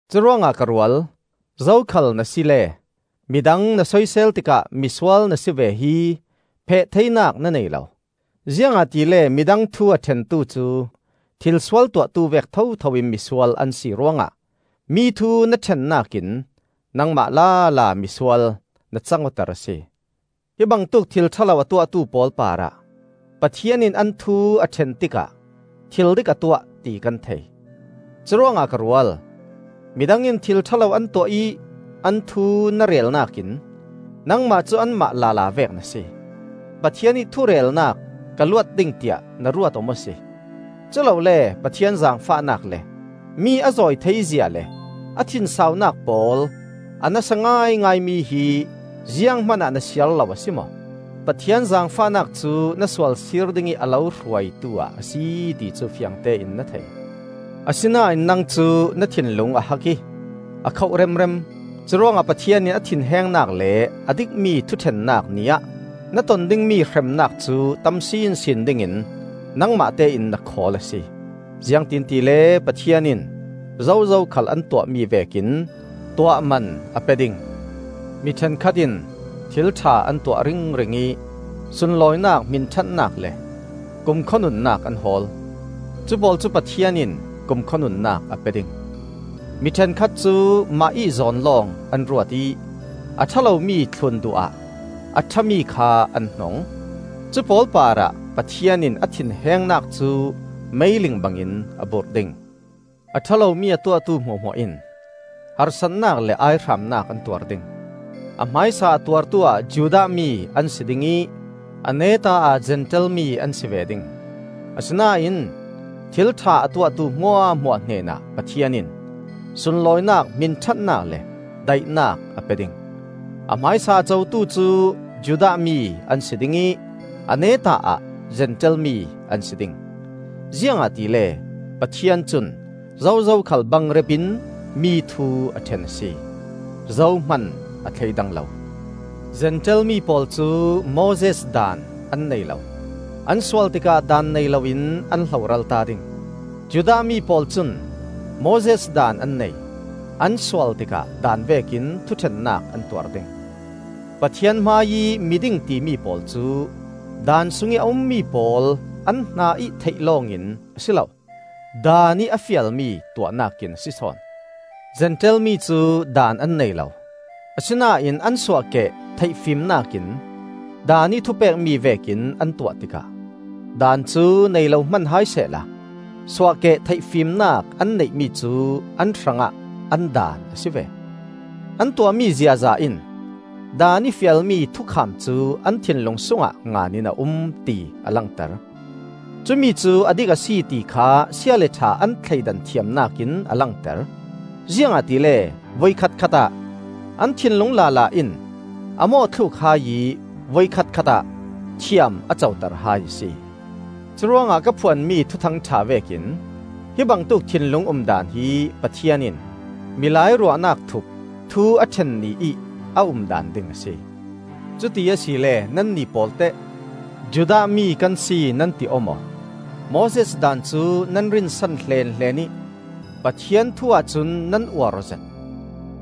Curuangah ka rual, zokhal na sile mi dang na soisel tikah misual na si ve hi pheh theinak na nei lo. Ziangahtile midang thu a ṭhentu cu thilsual tuahtu vek thotho in misual an si ruangah mi thu na ṭhennak in nangmah lala misual na cang awter a si. Hi bangtuk thil ṭha lo a tuahtu pawl parah Pathian in an thu a ṭhen tikah thil dik a tuah, ti kan thei. Curuangah ka rual, midang in thil ṭha lo an tuah ih an thu na relnak in nangmah cu anmah lala vek na si. Pathian ih thurelnak ka luat ding tiah na ruat aw maw si? Culole Pathian zaangfahnak le mi a zawi theizia le a thinsaunak pawl a nasa ngaingaimi hi zianghman ah na siar lo a si maw? Pathian zaangfahnak cu na sual sir dingih a lo hruaitu ah a si, ti cu fiangte in na thei. Asinain nang cu na thinlung a hak ih a khoh remrem; curuangah Pathian in a thinhengnak le a dikmi thuṭhennak Ni ah na ton dingmi hremnak cu tam sinsin dingin nangmah tein na khawl a si. Ziangtin tile Pathian in zozo khal an tuahmi vekin tuahman a pe ding. Mi ṭhenkhat in thil ṭha an tuah ringring ih sunlawinak, hminṭhatnak le kumkhua nunnak an hawl. Cupawl cu Pathian in kumkhua nunnak a pe ding. Mi ṭhenkhat cu mahih zawn lawng an ruat ih a ṭha lomi thlun duh ah a ṭhami kha an hnong. Cupawl parah Pathian in a thinhengnak cu meiling bangin a burh ding. A ṭha lomi a tuahtu hmuahhmuah in harsatnak le aihramnak an tuar ding; a hmaisa a tuartu ah Judah mi an si ding ih a neta ah Zentail mi an si ve ding. Asinain thil ṭha a tuahtu hmuahhmuah hnenah Pathian in sunlawinak, hminṭhatnak le daihnak a pe ding; a hmaisa a cotu cu Judah mi an si ding ih a neta ah Zentail mi an si ding. Ziangahtile Pathian cun zozo khal bangrep in mi thu a ṭhen a si. Zohman a thleidang lo. Zentail mi pawl cu Moses Daan an nei lo; an sual tikah Daan nei loin an hloralta ding. Judah mi pawl cun Moses Daan an nei; an sual tikah Daan vekin thuṭhennak an tuar ding. Pathian hmaiih miding timi pawl cu Daan sungih a ummi pawl an hna ih theih lawngin a si lo; Daan ih a fialmi tuahnak in a si sawn. Zentail mi cu Daan an nei lo; asinain an suahkeh theihfimnak in Daan ih thupekmi vekin an tuah tikah Daan cu nei lo hman hai sehla suahkeh theihfimnak an neihmi cu an hrangah an daan a si ve. An tuahmi ziaza in Daan ih fialmi thukham cu an thinlung sungah ngan in a um, ti a langter. Cumi cu a dik a si ti kha sia le ṭha an thleidan thiamnak in a langter; ziangahtile voikhat khatah an thinlung lala in a mawhthluk hai ih voikhat khatah thiam a coter hai a si. Curuangah ka phuanmi Thuthang ṭha vekin hi bangtuk thinlung umdaan hi Pathian in milai ruahnak thup thu a ṭhen ni ih a umdaan ding a si. Cuti asile nannih pawlteh? Judah mi kan si nan ti aw maw? Moses Daan cu nan rinsan hleenhleen ih Pathian thu ahcun nan uar awzet.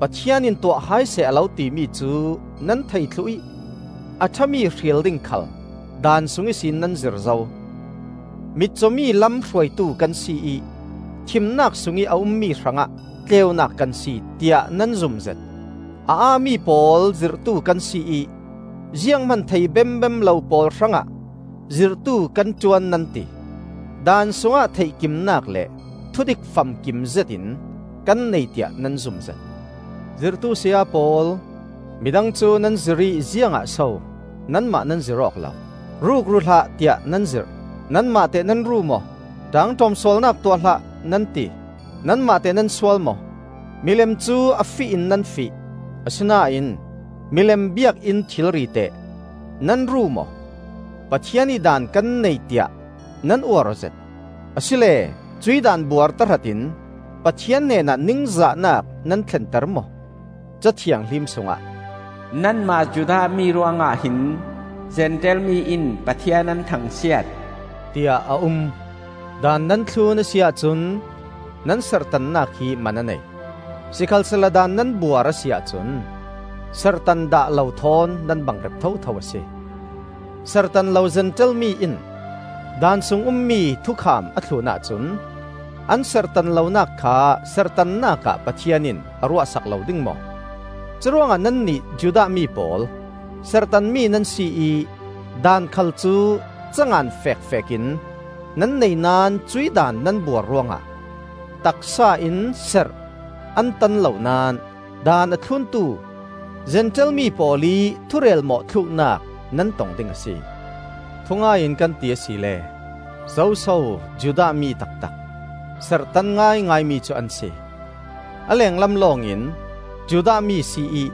Pathian in tuah hai seh a lo timi cu nan thei thluh ih a ṭhami hril ding khal Daan sung ihsin nan zir zo. Mitcawmi lam hruaitu kan si ih thimnak sungih a ummi hrangah tleunak kan si, tiah nan zumzet. A aa mi pawl zirhtu kan si ih zianghman thei bembem lo pawl hrangah zirhtu kan ṭuan nan ti. Daan sungah theih kimnak le thudik famkim zetin kan nei tiah nan zumzet. Zirhtu saya pawl, midang cu nan zirh ih ziangah so nanmah nan zirh awk lo? “Rukru hlah,” tiah nan zirh; nanmah teh nan ru maw? “ṭaangṭawm sualnak tuah hlah,” nan ti; nanmah teh nan sual maw? Milem cu a fih in nan fih; asinain milem biakinn thilri teh nan ru maw? Pathian ih Daan kan nei tiah nan uar awzet, asile cuih daan buar tahratin Pathian hnenah ningzahnak nan thlenter maw? Ca Thianghlim sungah, “Nanmah Judah mi ruangah hin Zentail mi in Pathian an thangsiat,” tiah a um. Daan nan thlun a si ahcun nan serhtannak hi man a nei; sikhalsehla Daan nan buar a si ahcun serhtan dah lo thawn nan bangrep thotho a si. Serhtan lo Zentail mi in Daan sung ummi thukham a thlun ahcun an serhtan lonak kha serhtannak ah Pathian in a ruahsak lo ding maw? Curuangah nannih Judah mi pawl, serhtanmi nan si ih Daan khal cu ca ngan fekfekin nan nei naón cuih Daan nan buar ruangah taksa in serh an tan lo naón Daan a thluntu Zentail mi pawl ih thurel mawhthluknak nan tong ding a si. Thungai in kan ti asile, zoso Judah mi taktak, serhtan ngaingaimi cu an si? A lenglam lawngin Judah mi si ih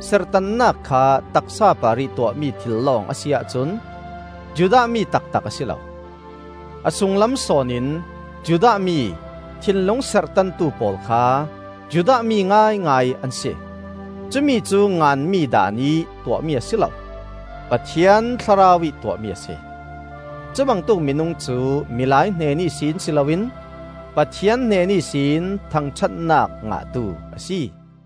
serhtannak kha taksa parih tuahmi thil lawng a si ahcun Judah mi taktak a si lo. A sunglam sawn in Judah mi, thinlung serhtantu pawl kha Judah mi ngaingai an si. Cumi cu nganmi Daan ih tuahmi a si lo, Pathian Thlarau ih tuahmi a si. Cubangtuk minung cu milai hnen ihsin si loin Pathian hnen ihsin thangṭhatnak ngahtu a si.